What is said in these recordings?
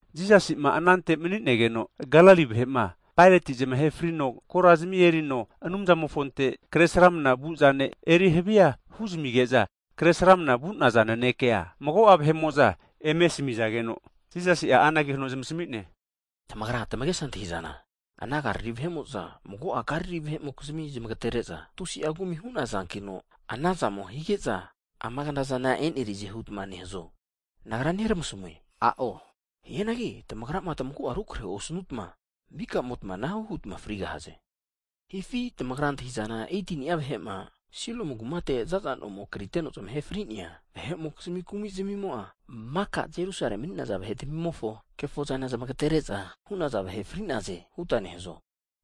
Jisasi'ma anante mani'negeno, Galili vahe'ma Paeroti zamahe frino korazmi erino Anumzamofonte kre sramna vu'zane eri havia huzamige'za, kre sramna vu'naza nanekea mago'a vahe'mo'za eme asmizageno, Jisasi'a anage huno eme zmasami'ne, tamagra tamagesa antahizana, ana Galili vahe'mo'za mago'a Galili vahe'mokizmi zmagetere'za tusi'a kumi hu'nazankino anazamo hige'za, ama knazana enerize hutma nehazo? Nagra neramasamue, a'o. Hianagi tamagrama tamagu'a rukrehe osanutma, mikamotma anahu hutma frigahaze. Hifi tamagra antahizana 18ni'a vahe'ma Siloamu kumate zaza nomo kriteno zmahe fri'nea vahe'mokizmi kumi'zmimo'a, maka Jerusale mani'naza vahetmimofo kefozana zmagetere'za hu'naza vahe fri'naze huta nehazo?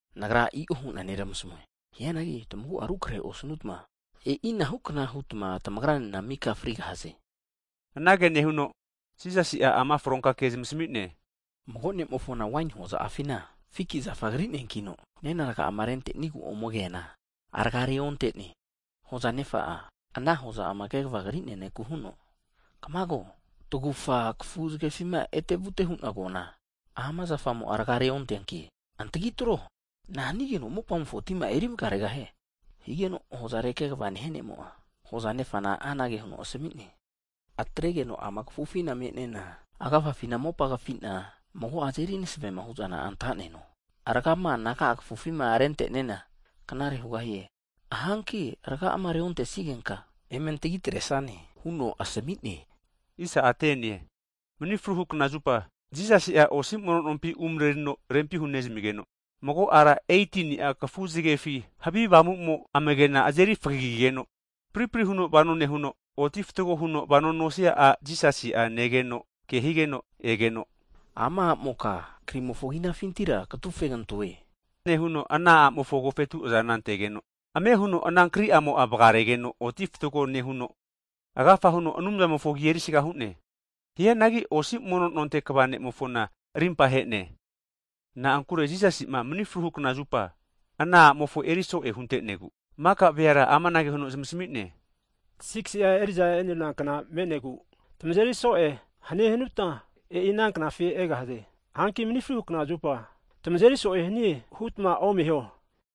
Nagra i'o hu'na neramasamue. Hianagi tamagu'a rukrahe osnutma e'inahu kna hutma tamagranena mika frigahaze. Anage nehuno, Jisasi'a ama fronka ke zmasami'ne, mago ne'mofona waini hoza'afina, fiki zafa kri'neankino, nena raga'ama rente'nenigu ome keana, raga'a reonte'ne. Hoza nefa'a, ana hoza'ama kegva kri'nea neku huno kamago, tagufa kafu zgefima etevute hu'na koana, ama zafamo'a raga'a reonteanki antagitro! Nahanigeno mopamofo tima'a eri vgaregahie? Higeno hozare kegva nehia ne'mo'a, hoza nefana anage huno asami'ne, atregeno ama kafufina me'nena, agafafina mopa kafina mago'a azeri masavema hu'zana antanena, rgama anaga'a kafufima renteniana, knare hugahie. Hanki raga'ama reontesigenka eme antagi atresane huno asami'ne. Mni fruhu (Sabati) knazupa Jisasi'a osi mono nompi umrerino rempi hunezmigeno, mago ara 18ni'a kafu zgefi havi avamumo amagena azeri fagagigeno, pripri huno vano nehuno, oti fatgo huno vano nosia a' Jisasi'a negeno ke higeno egeno, ama amoka, krimofo kinafintira katufegantoe. Nehuno ana a'mofo agofetu azana antegeno, ame huno ana kriamo'a vgaregeno oti fatgo nehuno, agafa huno Anumzamofo agi erisaga hu'ne. Hianagi osi mono nonte kva ne'mofona rimpa he'ne. Na'ankure Jisasi'ma manifru knazupa (sabat) ana a'mofo eri so'e hunte'negu, maka veara amanage huno zamasmi'ne. 6si'a eri'za eneruna kna me'negu, tamazeri so'e hanie hanutma, e'i ana knafi egahaze. Hanki mni fruhu (sabati) knazupa tmazeri so'e hanie hutma omeho.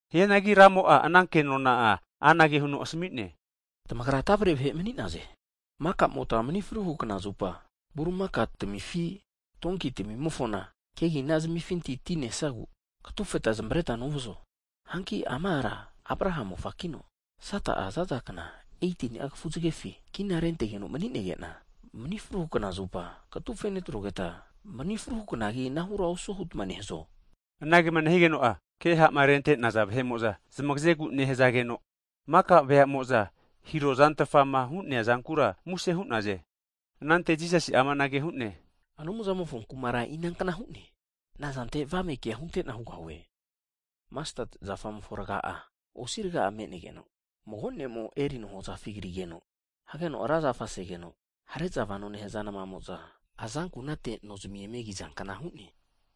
Hianagi Ramo'a ana kenona'a anage'a huno asami'ne, tamagra tavre vahe mani'naze. Makamotma mni fruhu (sabat) knazupa burimaka tamifi, donki tamimofona kegina zmifinti ti nesnagu katufeta zmavareta novazo? Hanki ama ara Abraha mofakino, Sata'a zaza kna 18ni'a kafuzgefi kina rentegeno mani'nege'na, mni fruhu (sabat) knazupa katufe netrogeta, mni fruhu knagi anahura osuo hutma nehazo? Anagema nehigeno'a, ke ha'ma rentaza vahe'mo'za zmagazegu nehazageno, maka veamo'za hirozantfama hu'neazankura muse hu'naze. Anante Jisasi'a amanage hu'ne, Anumzamofo kumara inankna hu'ne? Nazante avame kea huntena hugahue? Masteti zafamofo raga'a, osi raga'a me'negeno, mago nemo erino hoza'afi krigeno hageno ra zafa segeno, hare'za vanoma nehaza nmamo'za azankunate no zmi eme kizankna hu'ne.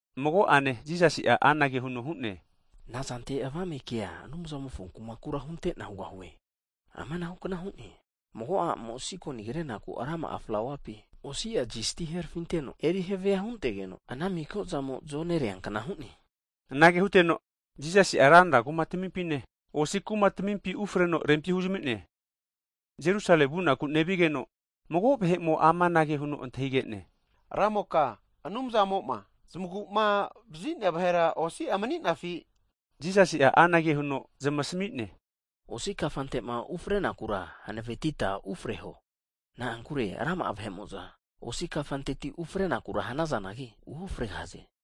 Mago'ane Jisasi'a anage huno hu'ne, Nazante avame kea Anumzamofo kumakura huntena hugahue? Amanahu kna hu'ne, mago a'mo sikoni krenaku rama'a flauapi, osi'a zisti herafinteno eri havia huntegeno, ana mikaflauamo zonerea kna hu'ne. Anage huteno, Jisasi'a ranra kuma'tamimpine, osi kuma'tamimpi ufreno rempi huzamime Jerusale vunaku nevigeno, mago vahe'mo amanage huno antahige'ne, Ramoka Anumzamo'ma zmaguma vazi'nea vahera osi'a mani'nafi? Jisasi'a anage huno zmasami'ne. Osi kafantema ufrenakura hanavetita ufreho. Na'ankure rama'a vahe'mo'za osi kafanteti ufrenakura hanazanagi, uofregahaze.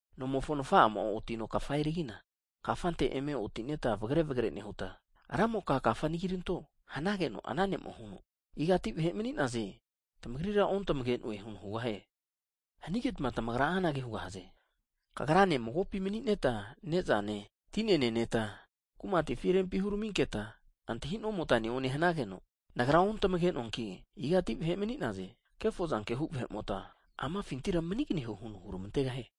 Nomofo nfa'amo otino kafa erigina, kafante eme otineta vagre vagre nehuta, Ramoka kafa anagiranto! Hanageno ana ne'mo'a huno, igati vahe mani'naze, tamagrira ontmage'noe huno hugahie. Hanigetma tamagra anage hugahaze. Kagrane magopi mani'neta ne'zane, tinena neneta kumatifi rempi huraminketa antahi'nomota neone hanageno, Nagra ontamagenoanki, igati vahe mani'naze, Kefozanke hu vahe'mota amafintira manigneho huno huramantegahie.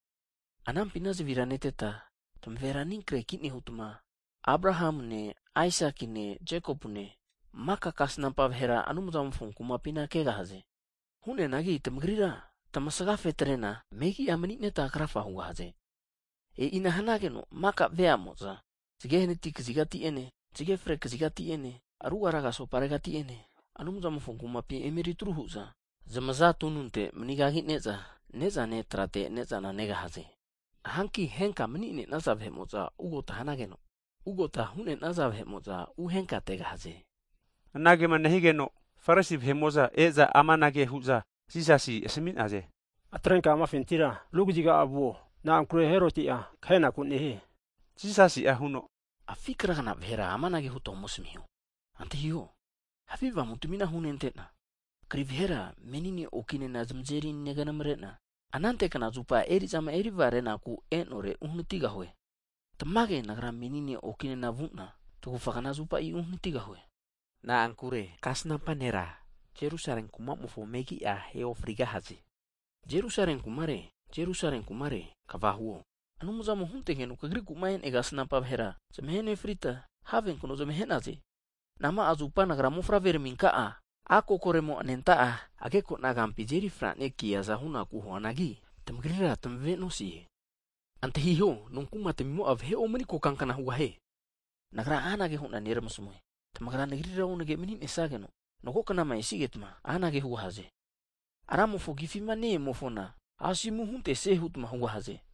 Anampina zavira neteta tmavera anikreki nehuta, Abrahamune Aisakine Jekopune, maka kasnampa vahera Anumzamofo kumapina kegahaze. Hu'neanagi tamagrira tamasgafetrena megi'a manineta krafa hugahaze. E'ina hanigeno maka veamo'za zge hanati kazigati'ene, zge fre kazigati'ene, ruga raga soparegati'ene Anumzamofo kumapi eme eri atru hu'za zmaza tununte (recline) manigagine'za ne'za netrate ne'zana negahze. Hanki henka mni'nenaza vahe'mo'za ugota hanageno, ugota hu'nenaza vahe'moza uhenkategahaze. Anagema nehigeno, Farisi vahe'mo'za e'za amanage hu'za Jisasi asmi'naze, atrenka amafintira ru kaziga vuo. Na'ankure Heroti'a kahenaku nehie. Jisasi'a huno, afi' kragna vahera amanage huta ome asmiho, antahiho havi avamu'tamina hunentena, kri vahera menine oki'nena zmazeri neganamrena, anante knazupa eri'zama erivgareku e'nore uhnatigahue. Tamage Nagra menine oki'nena vuna tagufa knazupa uhnatigahue. Na'ankure kasnampa nera, Jerusale kumamofo megi'a ahe ofrigahaze. Jerusale kumare, Jerusale kumare, Kva huo! Anumzamo huntegeno kagriku'ma e'nea kasnampa vahera zmahenefrita, havenkno zamahe'naze! Nama'a zupa Nagra mofavre raminka'a, a' kokoremo anenta'a agekona kampi azeri franekiaza hunaku huanagi, tamagrira tamave'nosie! Antahiho, nonkumatmimo'a vahe omni kokankna hugahie. Nagra anage hu'na neramasamue, tamagra Nagrira onage maninesageno mago knama esigetma, anage hugahaze. Ramofo agifi ne-emofona asomu huntesie hutma hugahaze.